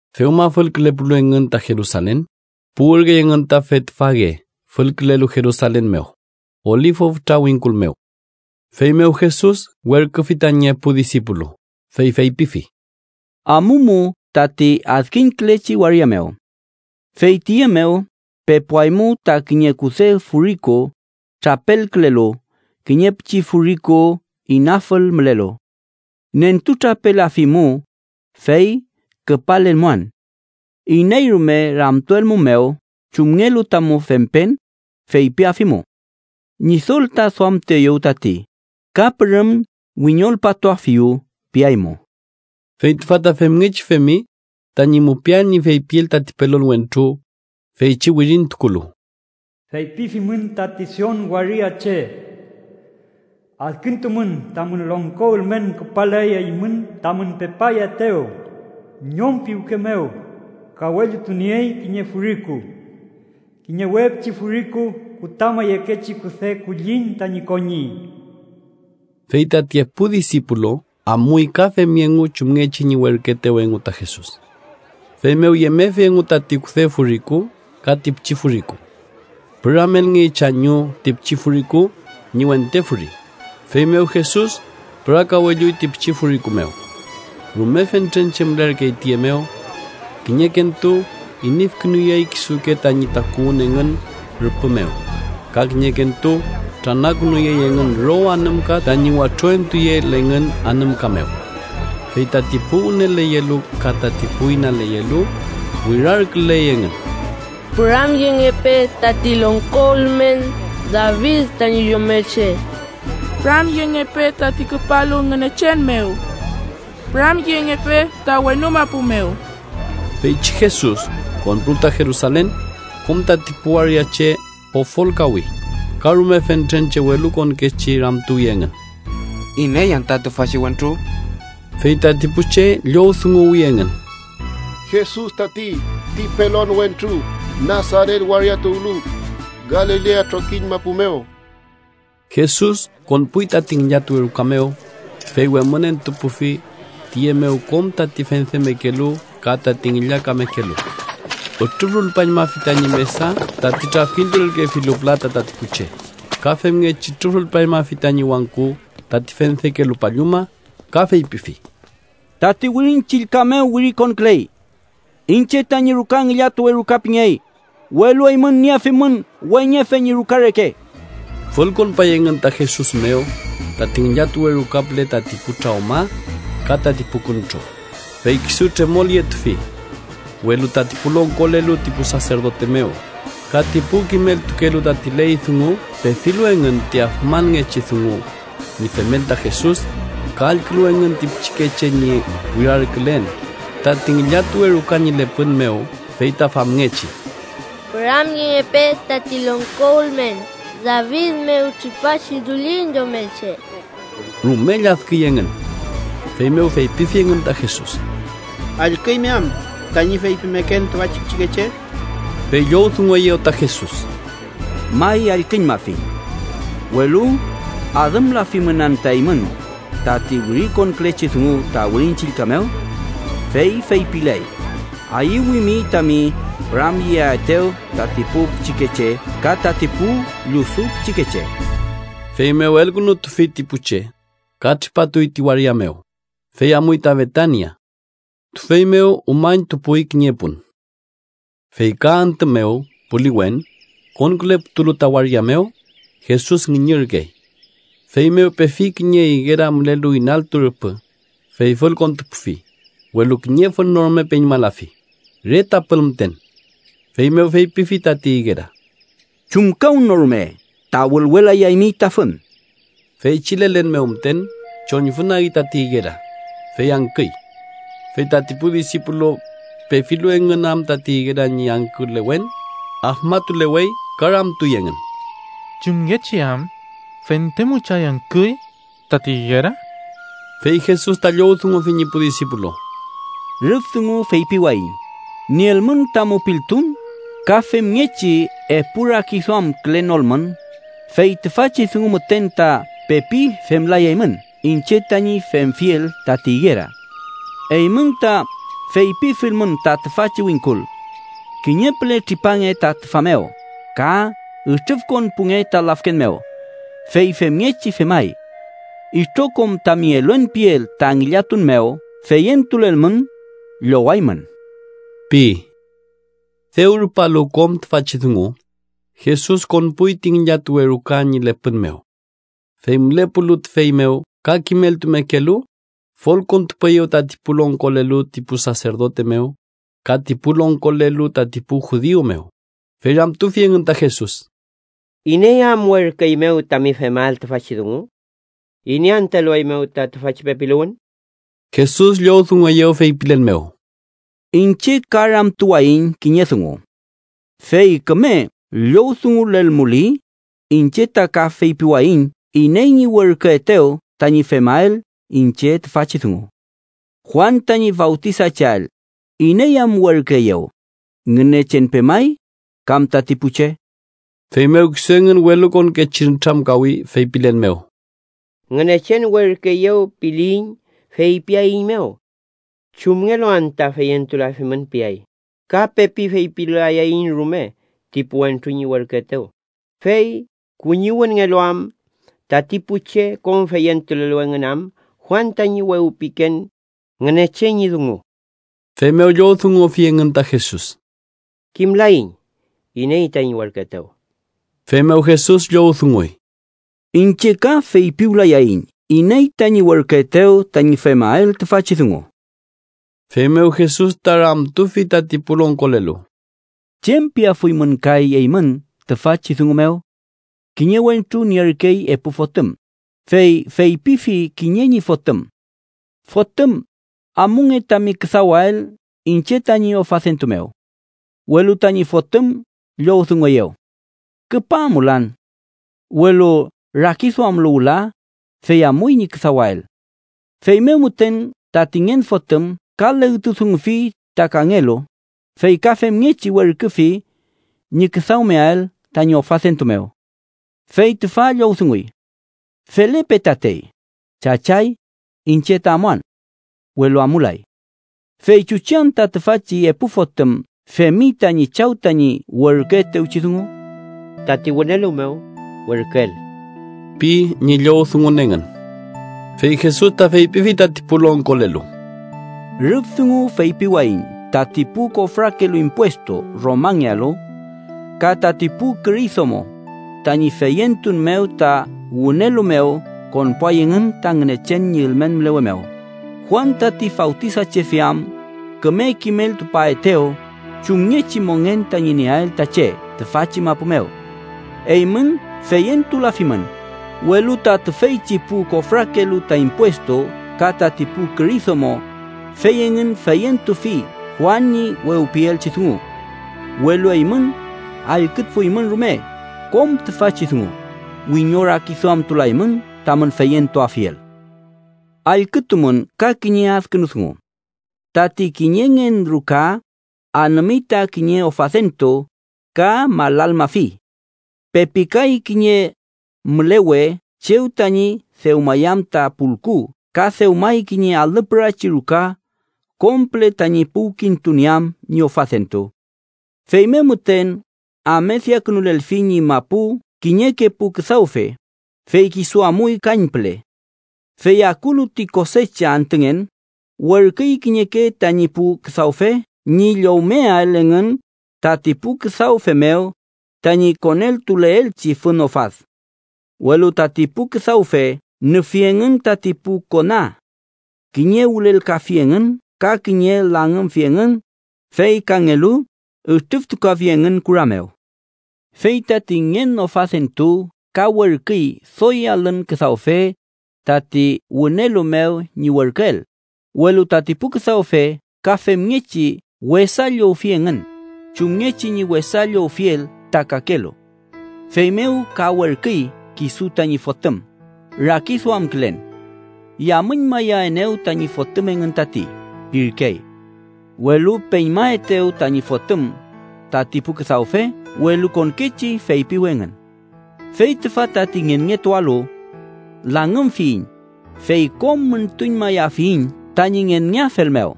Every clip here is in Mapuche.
Dewma fülkülepulu engün ta Jerusalen, puwürkey engün ta Betfage fülkülelu Jerusalen mew, Olifu fütra wingkul mew. Feymew Jesus werküfi tañi epu disipulu, fey feypifi: —Amumu tati adkiñkülechi waria mew. Fey tiye mew pepuaymu ta kiñe kude furiku trapelkülelu kiñe pichi furiku inafül mülelu. Nentutrapelafimu, fey küpalelmuan. Iney rume ramtuelmumew chumngelu tamu fempen, feypiafimu: ‘Ñidol ta duamtueyew tati’ ka ‘Pürüm wiñolpatuafiyu’ piaymu. Fey tüfa ta femngechi femi tañi mupiael ñi feypiel tati pelon wentru, feychi wirintukulu: “Feypifimün tati Sion waria che: ‘Adkintumün, tamün longko ülmen küpaley eymün tamün pepayaetew, ñom piwke mew, kawellutuley kiñe furiku, kiñe we pichi furiku mew, kutama yekechi kude kulliñ tañi koñi.’” Fey tati epu disipulu amuy ka femi engu chumngechi ñi werküetew engu ta Jesus. Feymew yemefi engu tati kude furiku ka ti pichi furiku. Püramelngey chañu ti pichi furiku ñi wente furi, feymew Jesus pürakawelluy ti pichi furiku mew. Rume fentren che mülerkey tiye mew. Kiñekentu inüfkünuyey kisuke tañi takuwün engün rüpü mew, ka kiñekentu tranakünuyey engün row anümka tañi watro entuyeel engün anümka mew. Fey tati pu wüneleyelu ka tati pu inaleyelu wirarküley engün: “¡Püramyengepe tati longko ülmen David tañi Yomelche! ¡Püramyengepe tati küpalu Ngünechen mew! ¡Püramyengepe ta wenu mapu mew!” Feychi Jesus konpulu ta Jerusalen, kom tati pu waria che pofolkawi, ka rume fentren che welukonkechi ramtuwi engün: —¿Iney anta tüfachi wentru? Fey tati pu che llowdunguwi engün: —Jesus tati, ti pelon wentru Nasaret waria tuwlu, Galilea trokiñ mapu mew. Jesus konpuy tati ngillatuwe ruka mew, fey wemünentupufi tiye mew kom tati fendemekelu ka tati ngillakamekelu. Ütrüfrulpañmafi tañi mesa tati trafkintulelkefilu pülata tati pu che, ka femngechi ütrüfrulpañmafi tañi wangku tati fendekelu palluma ka feypifi: —Tati Wirin Chillka mew wirikonküley: ‘Iñche tañi ruka ngillatuwe ruka pingey’, welu eymün nietufimün weñefe ñi ruka reke. Fülkonpay engün ta Jesus mew tati ngillatuwe ruka püle tati pu trawma ka tati pu küntro, fey kisu tremolyetufi. Welu tati pu longkolelu ti pu saserdote mew ka ti pu kimeltukelu tati ley dungu pefilu engün ti afmanngechi dungu ñi femel ta Jesus, ka allkülu engün ti pichikeche ñi wirarkülen tati ngillatuwe ruka ñi lepün mew fey ta famngechi: “¡Püramyengepe tati longko ülmen David mew tripachi dullin Yomelche!”, rume lladküy engün. Feymew feypifi engün ta Jesus: —¿Allküymi am tañi feypimeken tüfachi pichikeche? Fey llowdungueyew ta Jesus: —May, allküñmafiñ. Welu ¿adümlafimün anta eymün tati wirikonkülechi dungu ta Wirin Chillka mew? Fey feypiley: ‘Ayüwimi tami püramyeaetew tati pu pichikeche ka tati pu llusu pichikeche.’ Feymew elkünutufi ti pu che, ka tripatuy ti waria mew, fey amuy ta Betania. Tüfey mew umañtupuy kiñe pun. Fey ka antü mew puliwen, konküleputulu ta waria mew, Jesus ngüñürkey. Feymew pefi kiñe igera mülelu inaltu rüpü, fey fülkontupufi, welu kiñe fün no rume peñmalafi, re tapül müten. Feymew feypifi tati igera: —¡Chumkawnorume ta wülwelayaymi ta fün! Feychi lelen mew müten choñfünagi tati igera, fey angküy. Fey tati pu disipulu, pefilu engün am ti igera ñi angkülewen, afmatulewey ka ramtuy engün: —¿Chumngechi am fente müchay angküy tati igera? Fey Jesus ta llowdungufi ñi pu disipulu: —Rüf dungu feypiwayiñ nielmün ta mupiltun, ka femngechi epu rakiduamkülenolmün, fey tüfachi dungu müten ta pepi femlayaymün iñche tañi femfiel tati igera. Eymün ta feypifilmün ta tüfachi wingkul: ‘Kiñe püle tripange ta tüfa mew ka ütrüfkonpunge ta lafken mew’, fey femngechi femay. Itrokom tami eluen piel ta ngillatun mew feyentulelmün, llowaymün ―pi. Dew rupalu kom tüfachi dungu, Jesus konpuy ti ngillatuwe ruka ñi lepün mew. Fey mülepulu tüfey mew ka kimeltumekelu, fülkontupueyew tati pu longkolelu ti pu saserdote mew ka ti pu longkolelu tati pu judiu mew, fey ramtufi engün ta Jesus: —¿Iney am werküeymew tami femael tüfachi dungu? ¿Iney anta elueymew ta tüfachi pepiluwün? Jesus llowdungueyew feypilen mew: —Iñche ka ramtuwayiñ kiñe dungu. Fey küme llowdungulelmuli, iñche ta ka feypiwayiñ iney ñi werküetew tañi femael iñche tüfachi dungu. Juan tañi fawtisacheael, ¿iney am werküeyew? ¿Ngünechen pemay, kam tati pu che? Feymew kisu engün welukonkechi nütramkawi, feypilen mew: “ ‘Ngünechen werküeyew’, piliyiñ, feypiaeiñmew: ‘¿Chumngelu anta feyentulafimün?’ piay. Ka pepi feypilayaiñ rume ti pu wentru ñi werküetew, fey kuñiwünngelu am tati pu che kom feyentulelu engün am Juan tañi wewpiken Ngünechen ñi dungu.” Feymew llowdungufi engün ta Jesus: —Kimlaiñ iney tami werküetew. Feymew Jesus llowdunguy: —Iñche ka feypiwlayayiñ iney tañi werküetew tañi femael tüfachi dungu. Feymew Jesus ta ramtufi tati pu longkolelu: —¿Chem piafuymün kay eymün tüfachi dungu mew? Kiñe wentru nierkey epu fotüm, fey feypifi kiñe ñi fotüm: ‘Fotüm, amunge tami küdawael iñche tañi ofadentu mew.’ Welu tañi fotüm llowdungueyew: ‘¡Küpa amulan!’ Welu rakiduamlu wüla, fey amuy ñi küdawael. Feymew müten tati ngen fotüm ka legtudungufi ta kangelu, fey ka femngechi werküfi ñi küdawmeael tañi ofadentu mew. Fey tüfa llowdunguy: ‘Felepe tatey, chachay, iñche ta amuan.’ Welu amulay. ¿Fey chuchi anta tüfachi epu fotüm femi tañi chaw tañi werküetewchi dungu? —Tati wünelu mew werküel ―pi ñi llowdungun engün. Fey Jesus ta feypifi tati pu longkolelu: —Rüf dungu feypiwayiñ tati pu kofrakelu impuestu Romangealu, ka tati pu küri domo, tañi feyentun mew ta wünelu mew konpuay engün ta Ngünechen ñi ülmen mülewe mew, Juan tati Fawtisachefe am küme kimeltupaetew chumngechi mongen tañi nieael ta che tüfachi mapu mew. Eymün feyentulafimün, welu ta tüfeychi pu kofrakelu ta impuestu ka tati pu küri domo, fey engün feyentufi Juan ñi wewpielchi dungu. Welu eymün, allküfuymün rume kom tüfachi dungu, wiñorakiduamtulaymün tamün feyentuafiel. “Allkütumün ka kiñe adkünu dungu: tati kiñe ngen ruka anümi ta kiñe ofadentu ka malalmafi. Pepikay kiñe mülewe chew tañi dewmayam ta pulku ka dewmay kiñe alüpürachi ruka kom püle tañi puwkintunieam ñi ofadentu. Feymew müten amediakünulelfi ñi mapu kiñeke pu küdawfe, fey kisu amuy kañpüle. Fey akulu ti kosecha antüngen, werküy kiñeke tañi pu küdawfe ñi llowmeael engün tati pu küdawfe mew tañi koneltuleelchi fün ofad. “Welu tati pu küdawfe nüfi engün tati pu kona. Kiñe wülelkafi engün ka kiñe langümfi engün, fey kangelu ütrüftukafi engün kura mew. Fey tati ngen ofadentu ka werküy doy alün küdawfe tati wünelu mew ñi werküel, welu tati pu küdawfe ka femngechi wesa llowfi engün chumngechi ñi wesa llowfiel ta kakelu. “Feymew ka werküy kisu tañi fotüm, rakiduamkülen: ‘Yamüñmayaenew tañi fotüm engün tati’ pirkey. Welu peñmaetew tañi fotüm, tati pu küdawfe welukonkechi feypiwi engün: ‘Fey tüfa tati ngenngetualu. Langümfiyiñ, fey kom müntuñmayafiyiñ tañi ngenngeafel mew.’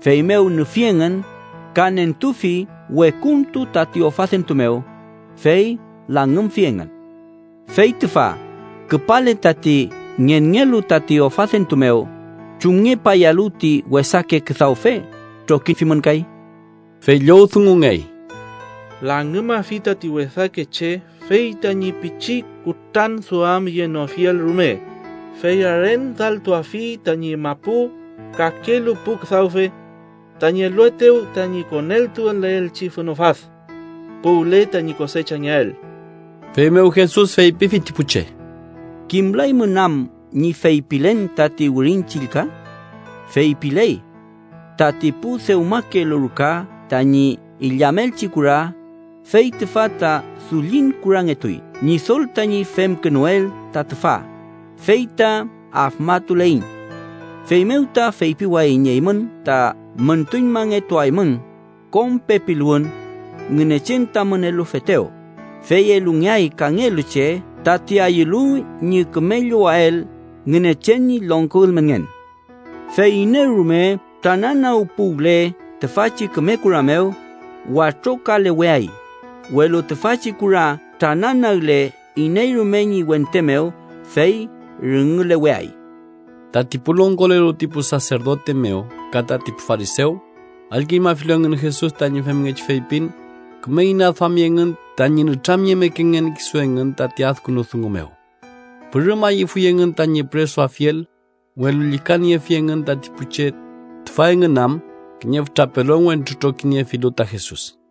Feymew nüfi engün, ka nentufi wekuntu tati ofadentu mew, fey langümfi engün. “Fey tüfa, küpale tati ngenngelu tati ofadentu mew, ¿chumngepayalu ti wesake küdawfe trokifimün kay?” Fey llowdungungey: —Langümafi tati wesake che fey tañi pichi kutranduamyenofiel rume, fey arendaltuafi tañi mapu kakelu pu küdawfe tañi eluaetew tañi koneltuleelchi fün ofad puwle tañi kosechangeael. Feymew Jesus feypifi ti pu che: —¿Kimlaymün am ñi feypilen tati Wirin Chillka? Feypiley: ‘Tati pu dewmakelu ruka tañi illamelchi kura, fey tüfa ta dullin kurangetuy. Ñidol tañi femkünuel ta tüfa, fey ta afmatuleiñ.’ Feymew ta feypiwayiñ eymün ta müntuñmangetuaymün kom pepiluwün Ngünechen tamün elufetew, fey elungeay kangelu che tati ayülu ñi küme llowael Ngünechen ñi longko ülmenngen. Fey iney rume trananagpuwle tüfachi küme kura mew, watrokaleweay, welu tüfachi kura trananagle iney rume ñi wente mew, fey rüngüleweay. Tati pu longkolelu ti pu saserdote mew ka tati pu farisew, allküñmafilu engün Jesus tañi femngechi feypin, küme inaduami engün tañi nütramyemekengen kisu engün tati adkünu dungu mew. Pürüm ayüfuy engün tañi püresuafiel, welu llükaniefi engün tati pu che, tüfa engün am kiñe fütra pelon wentru trokiniefilu ta Jesus.